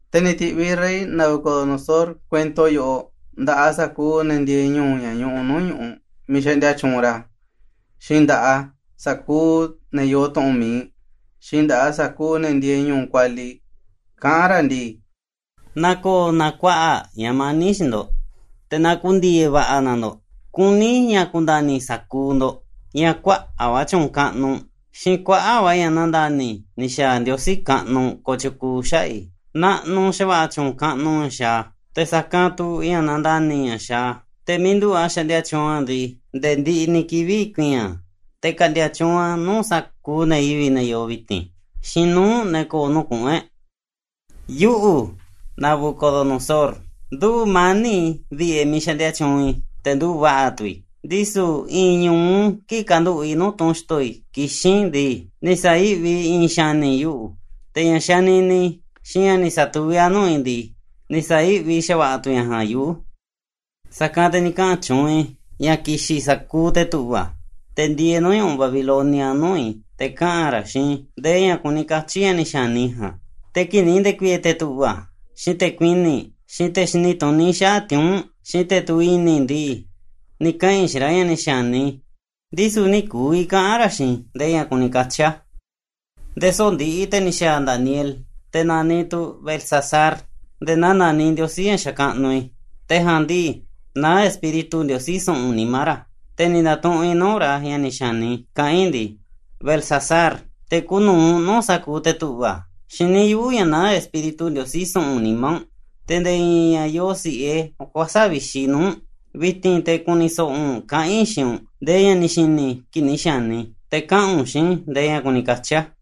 Te̱ ni̱ ti̱ꞌviꞌ rey Nabucodonosor kuento yoꞌoꞌ nda̱ꞌaꞌ sa̱kuuꞌ ne̱ ndieeꞌ ñu̱u̱, ña̱ ñuꞌuꞌ nuu̱ꞌ ñu̱ꞌuꞌ miiꞌ xaꞌndia tyuunꞌ ra̱, xiinꞌ nda̱ꞌaꞌ sa̱kuuꞌ ne̱ yoo tu̱ꞌu̱n mi̱iꞌ, xiinꞌ nda̱ꞌaꞌ sa̱kuuꞌ ne̱ ndieeꞌ ñu̱u̱ kualiꞌ, kaꞌán ra̱ ndii: “Na ko̱o̱ na kuaꞌa̱ꞌ ña̱ mani̱ꞌ xiinꞌ ndo̱ꞌ, te̱ na ku̱ndi̱e̱e̱ va̱ꞌa̱ na ndo̱ꞌ. Kuní i̱ ña̱ ku̱nda̱ni̱ sa̱kuuꞌ ndo̱ꞌ ña̱ kuaꞌa̱ꞌ va̱ tyu̱u̱n kaꞌnuꞌ, xiinꞌ kuaꞌa̱ꞌ va̱ ña̱ nandani̱ ni̱ xa̱a̱ Ndiosí kaꞌnuꞌ kotyukuuꞌ xaꞌa̱ꞌ i̱. ¡Naꞌnuꞌ xa̱va̱ꞌa̱ tyu̱u̱n kaꞌnuꞌ ña̱ xaaꞌ a̱, te̱ sa̱kanꞌ tu̱ ña̱ nandani̱ ña̱ xaaꞌ a̱! Te̱ miiꞌ nduꞌu̱ꞌ a̱ xaꞌndia tyuunꞌ a̱ ndii, nde̱e̱ ndiꞌiꞌ ni̱ kivi̱ꞌ ku̱i̱i̱n a̱, te̱ ka̱ꞌndi̱a̱ tyuunꞌ a̱ nuu̱ꞌ sa̱kuuꞌ ne̱ yivi̱ꞌ ne̱ yoo vi̱ti̱n, xiinꞌ nuu̱ꞌ ne̱ ko̱o̱ nuu̱ꞌ kuꞌu̱n e̱ꞌ. “Yuꞌu̱, Nabucodonosor, nduꞌu̱ꞌ mani̱ꞌ i̱ vi̱ꞌe̱ miiꞌ xaꞌndia tyuunꞌ i̱, te̱ nduꞌu̱ꞌ va̱ꞌa̱ tu̱ i̱. Ndisu̱ i̱i̱n ñu̱u kii̱ꞌ kanduꞌu̱ꞌ i̱ nuu̱ꞌ tunꞌ xto̱ i̱ kixín i̱ ndii, ni̱ sa̱yi̱ꞌvi i̱i̱n xa̱ni̱ yuꞌu̱, te̱ ña̱ xanini i̱, xiinꞌ ña̱ ni̱ sa̱tuví a̱ nuu̱ꞌ i̱ ndii, ni̱ sa̱yi̱ꞌvi xa̱va̱ꞌa̱ tu̱ ña̱ ja̱a̱nꞌ yuꞌu̱. Sa̱kanꞌ te̱ ni̱ kaꞌa̱n tyuunꞌ i̱ ña̱ ki̱xi̱n sa̱kuuꞌ te̱ tu̱ꞌva̱, te̱ ndieeꞌ nuu̱ꞌ ñu̱ꞌuꞌ Babilonia, nuu̱ꞌ i̱, te̱ kaꞌa̱n ra̱ xiinꞌ i̱ ndee ña̱ kuni katyi̱ ña̱ ni̱ xa̱ni i̱ ja̱a̱nꞌ. Te̱ kii̱ꞌ ni̱ nde̱ku̱i̱e̱ te̱ tu̱ꞌva̱, xiinꞌ te̱ kuini̱ꞌ, xiinꞌ te̱ xini tuní xaꞌa̱ꞌ tiuu̱nꞌ, xiinꞌ te̱ tuviꞌ i̱ni̱ ndii, ni̱ kaꞌa̱n i̱ xiinꞌ ra̱ ña̱ ni̱ xa̱ni i̱, ndisu̱ nï̱ ku̱vi̱ kaꞌa̱n ra̱ xiinꞌ i̱ ndee ña̱ kuni katyi̱ a̱. Nde̱e̱ soꞌo̱ꞌ ndiꞌiꞌ, te̱ ni̱ xa̱a̱ Daniel, te̱ naniꞌ tu̱ Beltsasar, nde̱e̱ naa naniꞌ ndiosí ña̱ xakaꞌnuꞌ i̱. Te̱ ja̱a̱nꞌ ndii, naá espíritu ndiosí su̱ꞌu̱n nimá ra̱, te̱ ni̱ nda̱tuꞌunꞌ i̱ nuu̱ꞌ ra̱ ña̱ ni̱ xa̱ni i̱, kaꞌán i̱ ndii: ‘Beltsasar, te̱ kuuꞌ nu̱uꞌ nuu̱ꞌ sa̱kuuꞌ te̱ tu̱ꞌva̱, xiní yuꞌu̱ ña̱ naá espíritu ndiosí su̱ꞌu̱n nimá u̱nꞌ, te̱ nde̱e̱ i̱i̱n ña̱ yoo si̱ꞌe kuäsa̱ꞌ vixi nuu̱ꞌ u̱nꞌ. Vi̱ti̱n te̱ ku̱ni̱ so̱ꞌo̱ u̱nꞌ kaꞌa̱n i̱ xiinꞌ u̱nꞌ ndee ña̱ ni̱ xi̱ni̱ i̱ kii̱ꞌ ni̱ xa̱ni i̱, te̱ kaꞌa̱n u̱nꞌ xiinꞌ i̱ ndee ña̱ kuni katyi̱ a̱.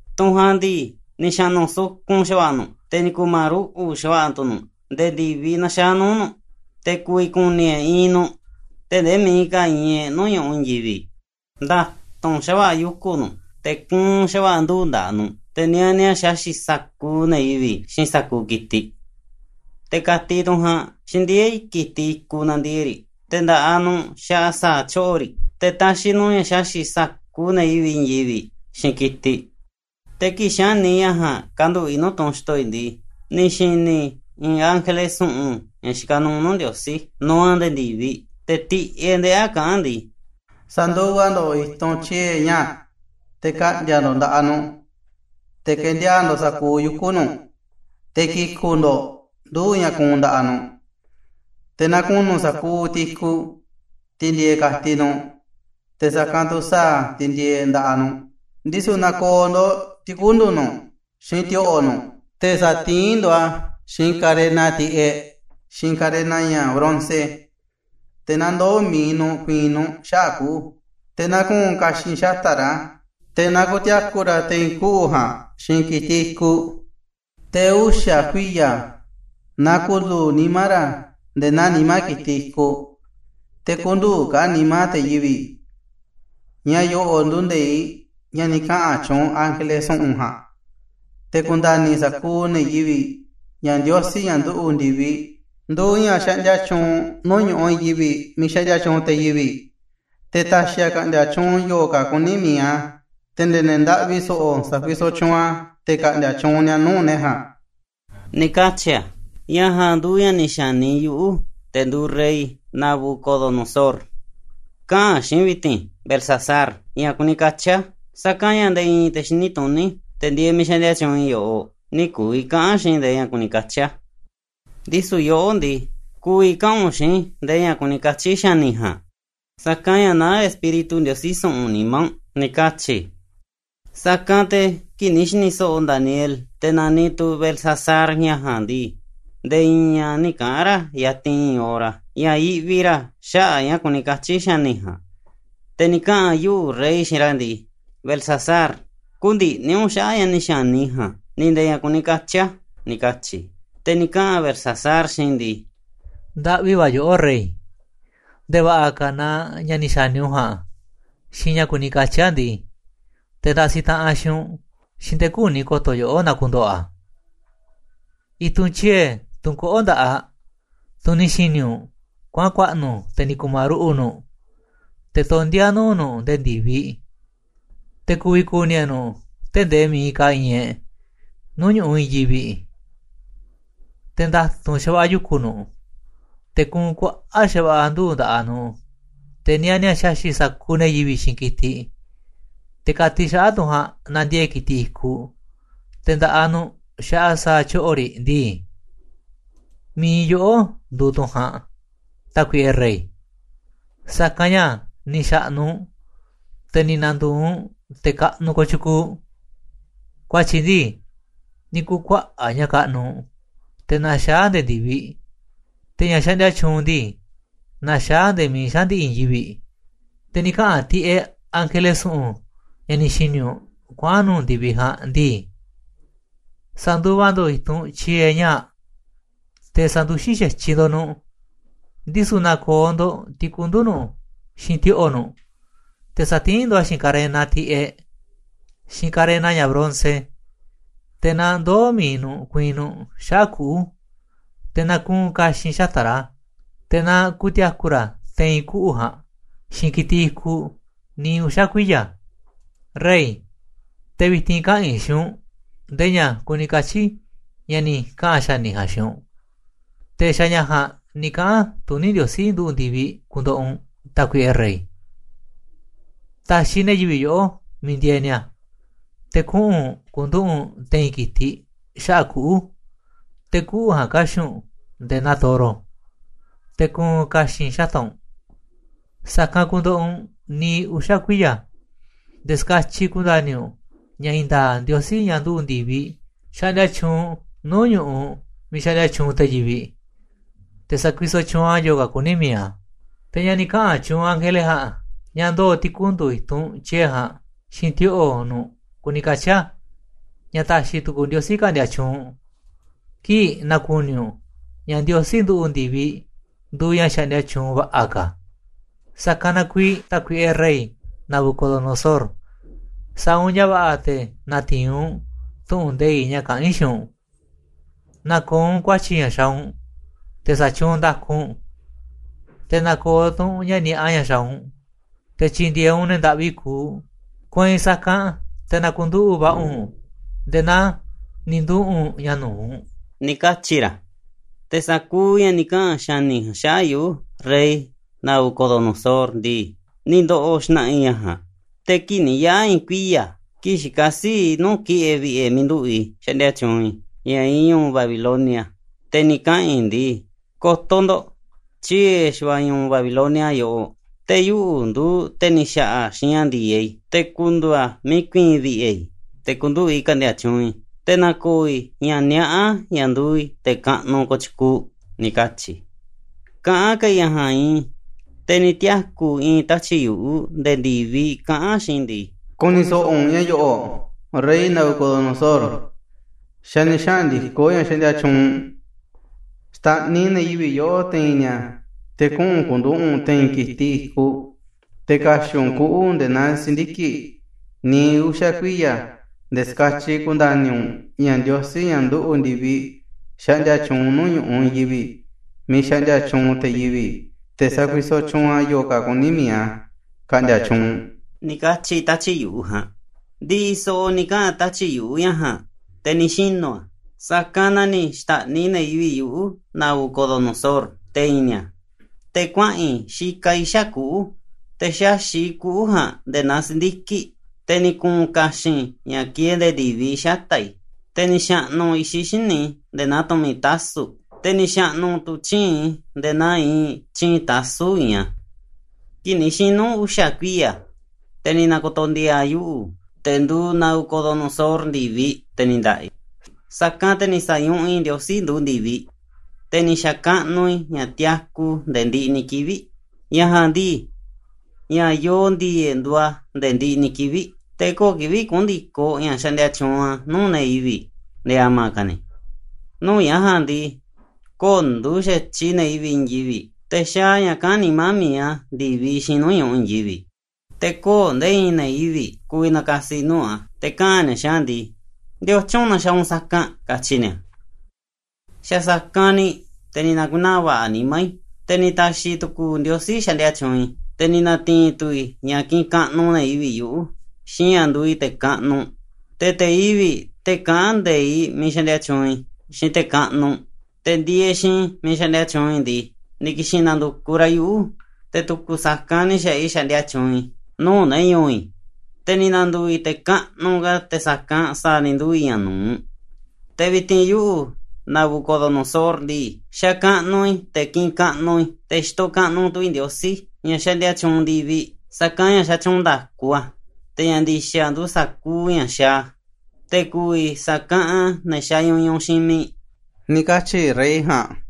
Tunꞌ ja̱a̱nꞌ ndii, ni̱ xa̱ꞌnu̱ sukun xa̱va̱ꞌa̱ nuꞌ, te̱ ni̱ ku̱ma̱ruꞌu̱ꞌ xa̱va̱ꞌa̱ tu̱ nuꞌ, nde̱e̱ ndi̱viꞌ naxaá nuu̱ꞌ nuꞌ, te̱ ku̱vi̱ ku̱ni̱ e̱ꞌ iinꞌ nuꞌ tee̱ꞌ ndee miiꞌ ka̱ iinꞌ e̱ꞌ nuu̱ꞌ ñu̱ꞌuꞌ i̱i̱n yivi̱ꞌ. Nda̱tu̱nꞌ xa̱va̱ꞌa̱ yuku̱ nuꞌ, te̱ kuunꞌ xa̱va̱ꞌa̱ nduu̱ꞌ nda̱ꞌaꞌ nuꞌ, te̱ niani a̱ xaxi̱ꞌ sa̱kuuꞌ ne̱ yivi̱ꞌ, xiinꞌ sa̱kuuꞌ ki̱tiꞌ. Te̱ ka̱tiꞌ tunꞌ ja̱a̱nꞌ xindieé ki̱tiꞌ i̱kuꞌ nandiee̱ꞌ riꞌ, te̱ nda̱ꞌaꞌ nuꞌ xaꞌa sa̱a̱ tyoꞌo̱ riꞌ, te̱ taxiꞌ nuꞌ ña̱ xaxi̱ꞌ sa̱kuuꞌ ne̱ yivi̱ꞌ i̱i̱n yivi̱ꞌ, xiinꞌ ki̱tiꞌ. “Te̱ kii̱ꞌ xa̱ni i̱ ña̱ ja̱a̱nꞌ kanduꞌu̱ꞌ i̱ nuu̱ꞌ tunꞌ xto̱ i̱ ndii, ni̱ xi̱ni̱ i̱ i̱i̱n ángele su̱ꞌu̱n ña̱ xikaꞌ nuuꞌ nuu̱ꞌ Ndiosí, nuuꞌ a̱ nde̱e̱ ndi̱viꞌ, te̱ tiꞌeꞌ ndeꞌí a̱, kaꞌán a̱ ndii: ‘Sa̱nduva ndo̱ꞌ i̱tunꞌ tyie̱ ñaa̱ꞌ, te̱ ka̱ꞌndi̱a̱ ndo̱ꞌ nda̱ꞌaꞌ nuꞌ, te̱ ke̱ndiaa̱ꞌ ndo̱ꞌ sa̱kuuꞌ yuku̱ nuꞌ, te̱ ki̱ku̱ꞌ ndo̱ꞌ nduu̱ꞌ ña̱ kuunꞌ nda̱ꞌaꞌ nuꞌ, te̱ na ku̱nu̱ sa̱kuuꞌ tiꞌ i̱kuꞌ, tiꞌ ndieeꞌ ka̱tiꞌ nuꞌ, te̱ sa̱kanꞌ tu̱ sa̱a̱ tiꞌ ndieeꞌ nda̱ꞌaꞌ nuꞌ. Ndisu̱ na̱ko̱o̱ ndo̱ꞌ ti̱kundu̱ nuꞌ, xiinꞌ ti̱o̱ꞌo̱ nuꞌ, te̱ sa̱tiín ndo̱ꞌ a̱ xiinꞌ karena tiꞌeꞌ, xiinꞌ karena ña̱ bronce, te̱ na ndoo̱ mi̱iꞌ nuꞌ ku̱i̱i̱n nuꞌ xaꞌa̱ꞌ kuꞌu̱. Te̱ na ku̱u̱n ka̱xi̱n xata̱ꞌ ra̱, te̱ na ku̱ti̱a̱ku̱ ra̱ te̱i̱n kuꞌu̱ ja̱a̱nꞌ xiinꞌ ki̱tiꞌ i̱kuꞌ. Te̱ uxa̱ kuiya̱ na ku̱ndu̱u̱ nimá ra̱ nde̱e̱ naa nimá ki̱tiꞌ i̱kuꞌ, te̱ kü̱ndu̱u̱ ka̱ a̱ nimá te̱ yivi̱ꞌ. Ña̱ yo̱ꞌo̱ꞌ nduuꞌ nde̱iꞌ ña̱ ni̱ kaꞌa̱n tyuunꞌ ángele su̱ꞌu̱n ja̱a̱nꞌ, te̱ ku̱nda̱ni̱ sa̱kuuꞌ ne̱ yivi̱ꞌ ña̱ Ndiosí, ña̱ nduꞌu̱ꞌ ndi̱viꞌ, nduuꞌ ña̱ xaꞌndia tyuunꞌ nuu̱ꞌ ñu̱ꞌuꞌ i̱i̱n yivi̱ꞌ miiꞌ xaꞌndia tyuunꞌ te̱ yivi̱ꞌ, te̱ ta̱xi̱ a̱ ka̱ꞌndi̱a̱ tyuunꞌ yo̱o̱ ka̱ kuní mi̱iꞌ a̱, te̱ nde̱e̱ ne̱ ndaꞌvi so̱ꞌo̱ sakuisoꞌ tyuunꞌ a̱ te̱ ka̱ꞌndi̱a̱ tyuunꞌ ni̱a̱ nuu̱ꞌ ne̱ ja̱a̱nꞌ,’ ni̱ katyi̱ a̱. “Ña̱ ja̱a̱nꞌ nduuꞌ ña̱ ni̱ xa̱ni yuꞌu̱, te̱ nduuꞌ rey Nabucodonosor, kaꞌa̱n xiinꞌ i̱ vi̱ti̱n, ‘Beltsasar, ña̱ kuni katyi̱ a̱, sa̱kanꞌ ña̱ nde̱e̱ i̱i̱n te̱ xini tuní, te̱ ndieeꞌ miiꞌ xaꞌndia tyuunꞌ i̱ yoꞌoꞌ, nï̱ ku̱vi̱ kaꞌa̱n xiinꞌ i̱ ndee ña̱ kuni katyi̱ a̱. Ndisu̱ yoꞌó ndii, ku̱vi̱ kaꞌa̱n u̱nꞌ xiinꞌ i̱ ndee ña̱ kuni katyi̱ xa̱ni̱ ja̱a̱nꞌ, sa̱kanꞌ ña̱ naá espíritu ndiosí su̱ꞌu̱n nimá u̱nꞌ,’ ni̱ katyi̱ i̱. “Sa̱kanꞌ te̱ kii̱ꞌ ni̱ xi̱ni̱ so̱ꞌo̱ Daniel, te̱ naniꞌ tu̱ Beltsasar, ña̱ ja̱a̱nꞌ ndii, nde̱e̱ i̱i̱n a̱ nï̱ kaꞌa̱n ra̱ yatinꞌ i̱i̱n hora, ña̱ yiꞌvi ra̱ xaꞌa̱ꞌ ña̱ kuni katyi̱ xa̱ni̱ ja̱a̱nꞌ. Te̱ ni̱ kaꞌa̱n yuꞌu̱, rey, xiinꞌ ra̱ ndii: ‘Beltsasar, kü̱ndi̱ꞌni̱ u̱nꞌ xaꞌa̱ꞌ ña̱ ni̱ xa̱ni i̱ ja̱a̱nꞌ, ni̱ nde̱e̱ ña̱ kuni katyi̱ a̱,’ ni̱ katyi̱ i̱. Te̱ ni̱ kaꞌa̱n Beltsasar xiinꞌ i̱ ndii: ‘Ndaꞌvi va̱ yoꞌó, rey, nde̱e̱ va̱ꞌa̱ ka̱ na ña̱ ni̱ xa̱ni u̱nꞌ ja̱a̱nꞌ, xiinꞌ ña̱ kuni katyi̱ a̱ ndii, te̱ ndasiꞌ taꞌanꞌ xiinꞌ u̱nꞌ, xiinꞌ te̱ küni ko̱to̱ yoꞌó na ku̱ndo̱ꞌo̱ a̱. I̱tunꞌ tyie̱, tunꞌ koꞌó nda̱ꞌaꞌ, tunꞌ ni̱ xi̱ni̱ u̱nꞌ kuaꞌa̱n ku̱a̱ꞌnu̱, te̱ ni̱ ku̱ma̱ruꞌu̱ꞌ nuꞌ, te̱ tondíá nuu̱ꞌ nuꞌ nde̱e̱ ndi̱viꞌ, te̱ ku̱vi̱ ku̱ni̱ e̱ꞌ nuꞌ tee̱ꞌ ndee miiꞌ ka̱ iinꞌ e̱ꞌ nuu̱ꞌ ñu̱ꞌuꞌ i̱i̱n yivi̱ꞌ, te̱ nda̱tu̱nꞌ xa̱va̱ꞌa̱ yuku̱ nuꞌ, te̱ kuunꞌ kuaꞌa̱ꞌ xava̱ꞌa̱ nduu̱ꞌ nda̱ꞌaꞌ nuꞌ, te̱ niani a̱ xaxi̱ꞌ sa̱kuuꞌ ne̱ yivi̱ꞌ xiinꞌ ki̱tiꞌ, te̱ ka̱tiꞌ xaꞌa̱ꞌ tunꞌ ja̱a̱nꞌ nandiee̱ꞌ ki̱tiꞌ i̱kuꞌ, te̱ nda̱ꞌaꞌ nuꞌ xaꞌa sa̱a̱ tyoꞌo̱ riꞌ ndii, mi̱iꞌ yoꞌó nduuꞌ tunꞌ ja̱a̱nꞌ, tákuiꞌe rey, sa̱kanꞌ ña̱ ni̱ xa̱ꞌnu̱ u̱nꞌ, te̱ ni̱ na̱ndu̱u̱ u̱nꞌ te̱ kaꞌnuꞌ kotyukuuꞌ. Ku̱a̱tyi̱ ndii, ni̱ ku̱kuaꞌa̱ꞌ ña̱ kaꞌnuꞌ u̱nꞌ, te̱ naxaá nde̱e̱ ndi̱viꞌ, te̱ ña̱ xaꞌndia tyuunꞌ u̱nꞌ ndii, naxaá a̱ nde̱e̱ miiꞌ xaꞌa̱n ndi̱ꞌi̱ i̱i̱n yivi̱ꞌ. Te̱ ni̱ kaꞌa̱n tiꞌeꞌ ángele su̱ꞌu̱n, ña̱ ni̱ xi̱ni̱ u̱nꞌ kuaꞌa̱n nu̱u̱ ndi̱viꞌ ja̱a̱nꞌ ndii: Sa̱nduva ndo̱ꞌ i̱tunꞌ tyie̱ ñaa̱ꞌ, te̱ sa̱nduxín xa̱tyiꞌ ndo̱ꞌ nuꞌ, ndisu̱ na̱ko̱o̱ ndo̱ꞌ ti̱kundu̱ nuꞌ, xiinꞌ ti̱o̱ꞌo̱ nuꞌ, te̱ sa̱tiín ndo̱ꞌ a̱ xiinꞌ karena tiꞌeꞌ, xiinꞌ karena ña̱ bronce, te̱ na ndoo̱ mi̱iꞌ nuꞌ ku̱i̱i̱n nuꞌ xaꞌa̱ꞌ kuꞌu̱. Te̱ na ku̱u̱n ka̱xi̱n xata̱ꞌ ra̱, te̱ na ku̱ti̱a̱ku̱ ra̱ te̱i̱n kuꞌu̱ ja̱a̱nꞌ, xiinꞌ kitiꞌ i̱kuꞌ niiꞌ uxa̱ kuiya̱. Rey, te̱ vi̱ti̱n kaꞌa̱n i̱ xiinꞌ u̱nꞌ ndee ña̱ kuni katyi̱ ña̱ ni̱ kaꞌa̱n xa̱ni̱ ja̱a̱nꞌ xiinꞌ u̱nꞌ, te̱ xa̱ ña̱ ja̱a̱nꞌ ni̱ kaꞌa̱n tuní Ndiosí nduꞌu̱ꞌ ndi̱viꞌ ku̱ndo̱ꞌo̱ u̱nꞌ, tákuiꞌe rey. Ta̱xiꞌ ne̱ yivi̱ꞌ yoꞌó miiꞌ ndieeꞌ ni̱a̱, te̱ kuꞌu̱n u̱nꞌ ku̱nduꞌu̱ꞌ u̱nꞌ te̱i̱n ki̱tiꞌ xaꞌa̱ꞌ kuꞌu̱, te̱ kuꞌu̱ ja̱a̱nꞌ ka̱xi̱ꞌ u̱nꞌ nde̱e̱ naa toro, te̱ ku̱u̱n ka̱xi̱n xata̱ꞌ u̱nꞌ, sa̱kanꞌ ku̱ndo̱ꞌo̱ u̱nꞌ niiꞌ uxa̱ kuiya̱ nde̱e̱ ska̱tyiꞌ ku̱nda̱ni̱ u̱nꞌ ña̱ i̱i̱n nda̱a̱ꞌ Ndiosí, ña̱ nduꞌu̱ꞌ ndi̱viꞌ, xaꞌndia tyuunꞌ nuu̱ꞌ ñu̱ꞌuꞌ miiꞌ xaꞌndia tyuunꞌ te̱ yivi̱ꞌ, te̱ sakuisoꞌ tyuunꞌ a̱ yo̱o̱ ka̱ kuní mi̱iꞌ a̱. Te̱ ña̱ ni̱ kaꞌa̱n tyuunꞌ ángele ja̱a̱nꞌ ña̱ ndoo̱ ti̱kundu̱ i̱tunꞌ tyie̱ ja̱a̱nꞌ xiinꞌ ti̱o̱ꞌo̱ nuꞌ kuni katyi̱ a̱ ña̱ ta̱xi̱ tu̱ku̱u̱ Ndiosí ka̱ꞌndi̱a̱ tyuunꞌ u̱nꞌ kii̱ꞌ na̱ku̱ni̱ u̱nꞌ ña̱ Ndiosí nduꞌu̱ꞌ ndi̱viꞌ nduuꞌ ña̱ xaꞌndia tyuunꞌ va̱ꞌa̱ ka̱. Sa̱kanꞌ na kuiiꞌ, tákuiꞌe rey Nabucodonosor, sa̱a̱ u̱nꞌ ña̱ va̱ꞌa̱, te̱ na̱ti̱i̱n u̱nꞌ tu̱ꞌu̱n nde̱iꞌ ña̱ kaꞌa̱n i̱ xiinꞌ u̱nꞌ. Na̱ko̱o̱ u̱nꞌ ku̱a̱tyi̱ ña̱ xa̱a̱ u̱nꞌ, te̱ sa̱tyuunꞌ nda̱ku u̱nꞌ, te̱ na̱ko̱o̱ tu̱ u̱nꞌ ña̱ ni̱a̱ꞌa ña̱ xaaꞌ u̱nꞌ, te̱ tyi̱ndi̱e̱eꞌ u̱nꞌ ne̱ ndaꞌvi kuuꞌ, kueinꞌ sa̱kanꞌ te̱ na̱ku̱nduꞌu̱ꞌ va̱ꞌa̱ u̱nꞌ nde̱e̱ naa ni̱ nduꞌu̱ꞌ u̱nꞌ ña̱ nu̱uꞌ,’ ni̱ katyi̱ ra̱. “Te̱ sa̱kuuꞌ ña̱ ni̱ kaꞌa̱n xa̱ni̱ ja̱a̱nꞌ xaꞌa̱ꞌ yuꞌu̱, rey Nabucodonosor ndii, ni̱ ndo̱ꞌo̱ xna̱ꞌa̱ i̱ ña̱ ja̱a̱nꞌ. Te̱ kii̱ꞌ ni̱ yaꞌa̱ i̱i̱n kuiya̱, kii̱ꞌ xikaꞌ sii̱ꞌ i̱ nuu̱ꞌ ki̱ꞌe̱ vi̱ꞌe̱ miiꞌ nduꞌu̱ꞌ i̱ xaꞌndia tyuunꞌ i̱, ña̱ iinꞌ ñu̱u̱ Babilonia, te̱ ni̱ kaꞌa̱n i̱ ndii: ‘Ko̱to̱ ndo̱ꞌ, tyie̱ xa̱va̱ꞌa̱ ñu̱u̱ Babilonia yoꞌoꞌ, te̱ yuꞌu̱ nduuꞌ te̱ ni̱ xa̱ꞌa̱ a̱ xiinꞌ ña̱ ndi̱e̱eꞌ i̱ te̱ ku̱ndu̱u̱ a̱ miiꞌ ku̱i̱i̱n vi̱ꞌe̱ i̱, te̱ ku̱nduꞌu̱ꞌ i̱ ka̱ꞌndi̱a̱ tyuunꞌ i̱, te̱ na̱ko̱o̱ i̱ ña̱ niaꞌá ña̱ nduuꞌ i̱ te̱ kaꞌnuꞌ kotyukuuꞌ,’ ni̱ katyi̱ i̱. “Kaꞌán ka̱ i̱ ña̱ ja̱a̱nꞌ iinꞌ i̱, te̱ ni̱ tiaku̱ i̱i̱n tatyi̱ꞌ yu̱ꞌuꞌ nde̱e̱ ndi̱viꞌ kaꞌán a̱ xiinꞌ i̱ ndii: ‘Ku̱ni̱ so̱ꞌo̱ u̱nꞌ ña̱ yo̱ꞌo̱ꞌ, rey Nabucodonosor, xa̱ ni̱ xaꞌa̱n ndi̱koꞌ ña̱ xaꞌndia tyuunꞌ u̱nꞌ. Xta̱ꞌniꞌ ne̱ yivi̱ꞌ yoꞌó te̱i̱n ni̱a̱ te̱ kuꞌu̱n u̱nꞌ ku̱nduꞌu̱ꞌ u̱nꞌ te̱i̱n ki̱tiꞌ i̱kuꞌ, te̱ ka̱xi̱ꞌ u̱nꞌ kuꞌu̱ nde̱e̱ naa si̱ndiki̱ꞌ niiꞌ uxa̱ kuiya̱, nde̱e̱ skatyiꞌ ku̱nda̱ni̱ u̱nꞌ ña̱ Ndiosí, ña̱ nduꞌu̱ꞌ ndi̱viꞌ, xaꞌndia tyuunꞌ nuuꞌ ñu̱ꞌuꞌ i̱i̱n yivi̱ꞌ miiꞌ xaꞌndiaa tyuunꞌ te̱ yivi̱ꞌ, te̱ sakuisoꞌ tyuunꞌ a̱ yo̱o̱ ka̱ kuní mi̱iꞌ a̱ ka̱ꞌndi̱a̱ tyuunꞌ,’ ni̱ katyi̱ tatyi̱ꞌ yu̱ꞌuꞌ ja̱a̱nꞌ.” “Ndi̱ꞌi̱ so̱ꞌo̱ ni̱ kaꞌa̱n tatyi̱ꞌ yu̱ꞌuꞌ ña̱ ja̱a̱nꞌ, te̱ ni̱ xinu̱ a̱, sa̱kanꞌ na ni̱ xta̱ꞌniꞌ ne̱ yivi̱ꞌ yuꞌu̱, Nabucodonosor, te̱i̱n ni̱a̱, te̱ kuaꞌa̱n i̱ xikaꞌ i̱ xaꞌa̱ꞌ kuꞌu̱, te̱ xaxi̱ꞌ i̱ kuꞌu̱ ja̱a̱nꞌ nde̱e̱ naa si̱ndiki̱ꞌ, te̱ ni̱ ku̱u̱n ka̱xi̱n ña̱ kieeꞌ nde̱e̱ ndi̱viꞌ xata̱ꞌ i̱, te̱ ni̱ xa̱ꞌnu̱ i̱xiꞌ xíniꞌ i̱ nde̱e̱ naa tu̱mi̱ tasu̱ꞌ, te̱ ni̱ xa̱ꞌnu̱ tu̱ tyii̱nꞌ i̱ nde̱e̱ naa iinꞌ tyii̱nꞌ tasu̱ꞌ iinꞌ a̱. “Kii̱ꞌ ni̱ xinu̱ uxa̱ kuiya̱, te̱ ni̱ na̱ko̱to̱ ndi̱a̱a̱ yuꞌu̱, te̱ nduuꞌ Nabucodonosor, ndi̱viꞌ, te̱ ni̱ nda̱ꞌa̱ i̱. Sa̱kanꞌ te̱ ni̱ sa̱ñuꞌuꞌ i̱ Ndiosí nduꞌu̱ꞌ ndi̱viꞌ, te̱ ni̱ xa̱kaꞌnuꞌ i̱ ña̱ tiaku nde̱e̱ ndiꞌiꞌ ni̱ kivi̱ꞌ. Ña̱ ja̱a̱nꞌ ndii, ña̱ yoo ndi̱e̱e̱ꞌ nduuꞌ a̱ nde̱e̱ ndiꞌiꞌ ni̱ kivi̱ꞌ, te̱ kö̱o̱ kivi̱ꞌ kuꞌu̱n ndi̱koꞌ ña̱ xaꞌndia tyuunꞌ a̱ nuu̱ꞌ ne̱ yivi̱ꞌ nde̱e̱ a̱ma̱ ka̱ ni̱. Nuu̱ꞌ ña̱ ja̱a̱nꞌ ndii, kö̱o̱ nduuꞌ xa̱tyiꞌ ne̱ yivi̱ꞌ i̱i̱n yivi̱ꞌ, te̱ xaaꞌ a̱ ña̱ kaꞌán nimá mi̱iꞌ a̱ ndi̱viꞌ, xiinꞌ nuu̱ꞌ ñu̱ꞌuꞌ i̱i̱n yivi̱ꞌ. Te̱ kö̱o̱ nde̱e̱ i̱i̱n ne̱ yivi̱ꞌ ku̱vi̱ na̱ka̱si̱ nuu̱ꞌ a̱, te̱ kaꞌa̱n ni̱a̱ xiinꞌ a̱ ndii: ¿Ndiotyun na xaaꞌ u̱nꞌ sa̱kanꞌ? katyi̱ ni̱a̱. “Xa̱ sa̱kanꞌ ni̱ te̱ ni̱ na̱ku̱naa̱ va̱ꞌa̱ nimá i̱, te̱ ni̱ ta̱xi̱ tu̱ku̱u̱ Ndiosí xaꞌndia tyuunꞌ i̱, te̱ ni̱ na̱ti̱i̱n tu̱ i̱ ña̱ kiꞌinꞌ kaꞌnuꞌ ne̱ yivi̱ꞌ yuꞌu̱, xiinꞌ ña̱ nduuꞌ i̱ te̱ kaꞌnuꞌ. Te̱ te̱ yivi̱ꞌ, te̱ kaꞌán nde̱iꞌ miiꞌ xaꞌndia tyuunꞌ i̱, xiinꞌ te̱ kaꞌnuꞌ, te̱ ndieeꞌ xiinꞌ i̱ miiꞌ xaꞌndia tyuunꞌ i̱ ndii, ni̱ ki̱xi̱n na̱ndu̱kuꞌ ra̱ yuꞌu̱, te̱ tu̱ku̱ sa̱kanꞌ ni̱ xa̱ꞌaꞌ i̱ xaꞌndia tyuunꞌ i̱ nuu̱ꞌ ne̱ ñu̱u̱ i̱, te̱ ni̱ na̱ndu̱u̱ i̱ te̱ kaꞌnuꞌ ka̱ te̱ sa̱kanꞌ sa̱a̱ ni̱ nduu̱ i̱ ña̱ nu̱uꞌ. “Te̱ vi̱ti̱n yuꞌu̱, Nabucodonosor ndii, xakaꞌnuꞌ i̱, te̱ kiꞌinꞌ kaꞌnuꞌ i̱, te̱ xitoꞌ kaꞌnuꞌ tu̱ i̱ Ndiosí, ña̱ xaꞌndia tyuunꞌ ndi̱viꞌ, sa̱kanꞌ ña̱ xatyuunꞌ nda̱ku a̱, te̱ ña̱ ndi̱xa̱ nduuꞌ sa̱kuuꞌ ña̱ xaaꞌ a̱, te̱ ku̱vi̱ sa̱kaꞌanꞌ a̱ ne̱ xañuñuꞌ xiinꞌ mi̱iꞌ,” ni̱ katyi̱ rey ja̱a̱nꞌ.